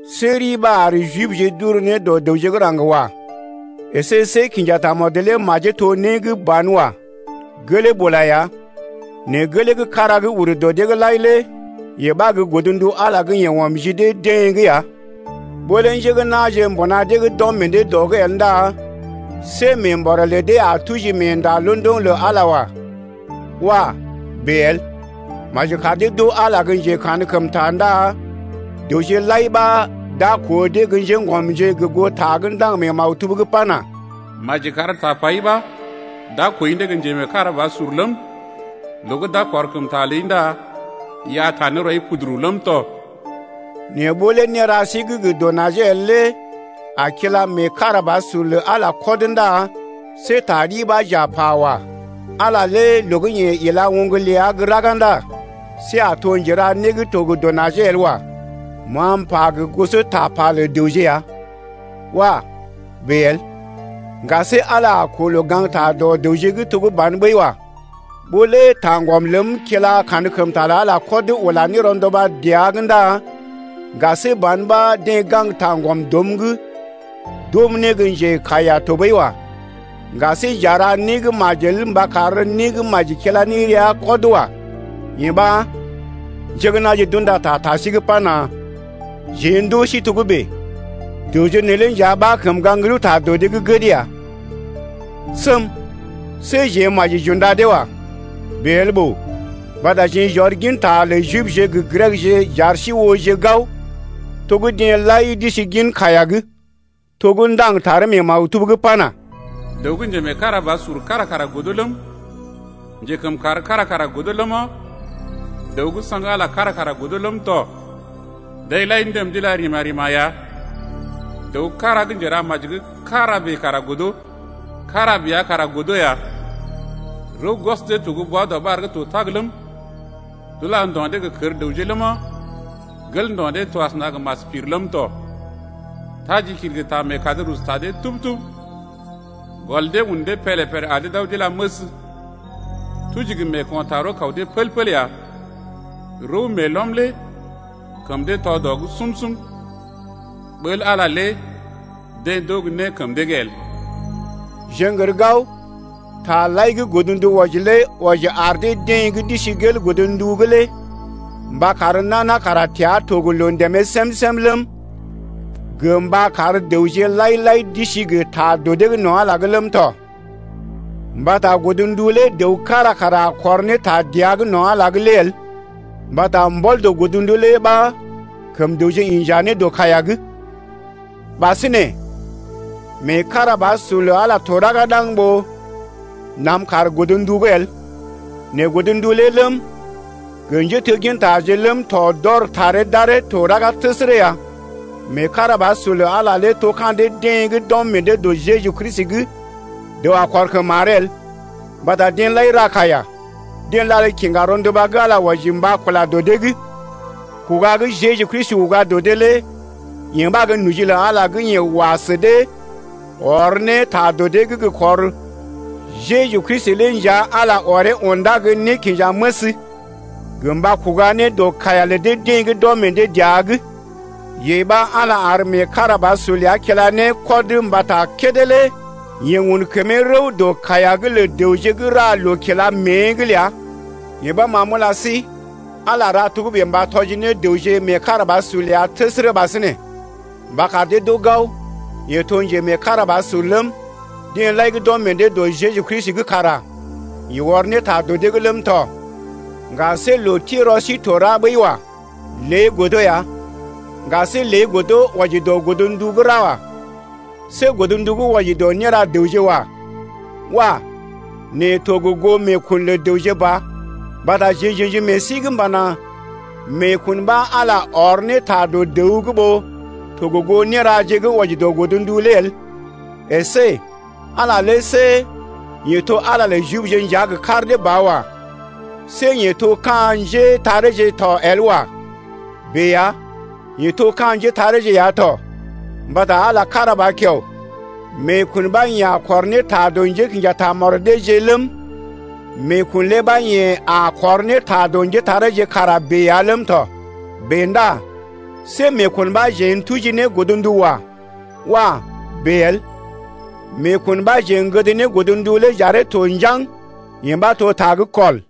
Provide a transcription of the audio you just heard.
See ri ɓa ar Jibje d’ur ne dɔ dəwje gə́ raŋg wa. Esé see kinja tamɔd lé majee to né gə́ banwa. Gelee bula ya, nɛ gelee gə́ kára gə́ ur dɔ dee’g lai lé yee ɓa gə́ godndu Ala gə́ yeḛ ɔm ji dee-deḛ’g ya. Ɓó lé njé gə́ na̰je mbuna dee’g d’ɔm meḛ dee dɔ’g el ndá see meembɔrè lə dee a tuji meenda londoŋ lə Ala wa. Wah! bèe el. Maji kar dee d’oo Ala gə́ njekankəmta ndá dəwje lai ɓa d’a koo dee gə́ njéŋgɔmje gə goo ta gə́ ndaŋg mee maktub’g pana: Maji kar tapai ɓa d’a kooi ne gə́ njemeekarabasur ləm, Loo gə́ d’a kɔrkəmta ləi ndá i a taa ne rɔi puduru ləm tɔ. Nɛ ɓó lé néra sí gə́ gə dɔ najee el lé a kila meekarabasur lə Ala lé kɔd ndá see ta ɗi ɓa j’a pa wa. Ala lé loo gə́ yeḛ kila oŋg ləa gə́ raga ndá see a to njera né gə́ to gə dɔ najee el wa. (Ma m’pa gə goso tapa lə dəwje ya.) Wah! bèe el. Ŋga see Ala a koo loo gaŋgta dɔ dəwje’g to gə́ ban ɓəi wa. Ɓó lé taŋgɔm ləm kila kankəmta lə Ala kɔd ula ne rɔnduba dəa’g ndá ŋga see ban ɓa deḛ gaŋg taŋgɔm dɔm’g d’oom ne gə́ njekaiya tɔɓəi wa. Ŋga see j’a ra né gə́ majel mba kar né gə́ maji kila ne rəa kɔd wa. Yee ɓa njé gə́ na̰je d’unda ta ta sí’g pana: Jeḛ ndoo sí togə́bè. Dəwje neelé nja ɓa kəm gaŋg rəwta dɔ dee’g gəd ya. Səm! See jeḛ maji j’unda dee wa. Bèe el ɓòo. Mbata jeḛ j’ɔr ginta lə Jibje gə Grekje j’ar sí ooje gao to gə́ deḛ lai d’isi gin kaiya’g, to gə́ ndaŋg taree mee maktub’g pana: Dəw gə́ njemeekarabasur kára kara godo ləm, Njekəmkàr kára kara godo ləma, Dəw gə́ saŋg Ala kára kara godo ləm tɔ. Deḛ lai ndəm d’ila rima-rima ya. Dəw kára gə́ njera maji gə́ kára bèe kara godo, Kára bèe ya kara godo ya. Rəw gwɔs dee to gə́ bwa-dɔɓar gə́ to tag ləm, D’ula ndo̰ dee gə kər dəwje ləma, Gel ndo̰ dee to asəna gə mas pir ləm tɔ. Tajikil gə ta meekad rusu ta dee tub-tub. Gɔl dee un dee pélé-pélé ar dee d’aw d’ila məs. Tuji gə meeko̰ taa rəw-kaw dee pəl-pəl ya. Rəw meelɔm lé kəm dee tɔ dɔ’g sum-sum. Ɓəl Ala lé deḛ d’oo gə́ né kəm dee’g el. Jeḛ n’gər gao taje lai gə́ godndu wɔji lé wɔji ar deḛ gə́ d’isi gel godndu’g lé mba kar nana kara təa to gə loo ndèmee sem-sem ləm, gə mba kar dəwje lai-lai d’isi gə ta dɔ dee’g no̰ Ala’g lé ləm tɔ. Mbata godndu lé dəw kára kara a kɔr ne ta dəa’g no̰ Ala’g el, mbata mbɔl dɔ godndu lé ɓa kəm dəwje inja ne dɔ kaiya’g. Ɓasinè meekarabasur lə Ala to raga ɗaŋg ɓó nam kaar godndu’g el, nɛ godndu lé ləm, gə njéteggintaje ləm tɔ d’ɔr taree d’aree to raga təsərə ya. Meekarabasur lə Ala lé to ka̰ dee-deḛ gə́ d’ɔm meḛ dee dɔ Jeju Kristi’g. Dəw a kɔr kəm maree el. Mbata deḛ lai ra kaiya, deḛ lal kiŋga rɔnduba gə́ Ala wɔji mba kula dɔ dee’g. Kuga gə́ Jeju Kristi uga dɔ dee lé yee ɓa gə́ noji lə Ala gə́ yeḛ wa sə dee ɔr ne ta dɔ dee’g gə kɔr. Jeju Kristi lé nja Ala ɔree undá ne gə́ nékinjaməs gə mba kuga ne dɔ kaiya lə deḛ gə́ d’ɔm meḛ dee dəa’g. Yee ɓa Ala ar meekarabasur ləa kila ne kɔd mbata kédé lé yeḛ un kəmee rəw dɔ kaiya’g lə dəwje gə́ ra loo kila mée’g ləa. Yee ɓa ma m’ula sí, Ala ra togə́bè mba tɔji ne dəwje meekarabasur ləa təsərə ɓasinè, mba kar dee d’oo gao, yeḛ to njemeekarabasur ləm, deḛ lai gə́ d’ɔm meḛ dee dɔ Jeju Kristi’g kara yeḛ ɔr ne ta dɔ dee’g ləm tɔ. Ŋga see loo ti rɔ sí to ra ɓəi wa. Lée godo ya. Ŋga see lée godo wɔji dɔ godndu gə́ ra wa. See godndu gə́ wɔji dɔ néra dəwje wa. Wah! nɛ to gə goo meekun lə dəwje ba. Mbata jeḛ j’ə̰ji meḛ sí’g m’pana: Meekun ɓa Ala ɔr ne ta dɔ dəw’g ɓó to gə goo néraje gə́ wɔji dɔ godndu lé el. Esé Ala lé see yeḛ to Ala lə Jibje nja gə kar dee ba wa. See yeḛ to ka̰ njétareeje to el wa. Bèe ya, yeḛ to ka̰ njétareeje ya tɔ. Mbata Ala kára ba kiao. Meekun ɓa yeḛ a kɔr ne ta dɔ njékḭja tamɔd deeje ləm, meekun lé ɓa yeḛ a kɔr ne ta dɔ njétareeje kara bèe ya ləm tɔ. Bèe ndá see meekun ɓa jeḛ n’tuji ne godndu wa. Wah! bèe el. Meekun ɓa jeḛ gəd ne godndu lé j’aree to njaŋg, yee ɓa to ta gə́ kɔl.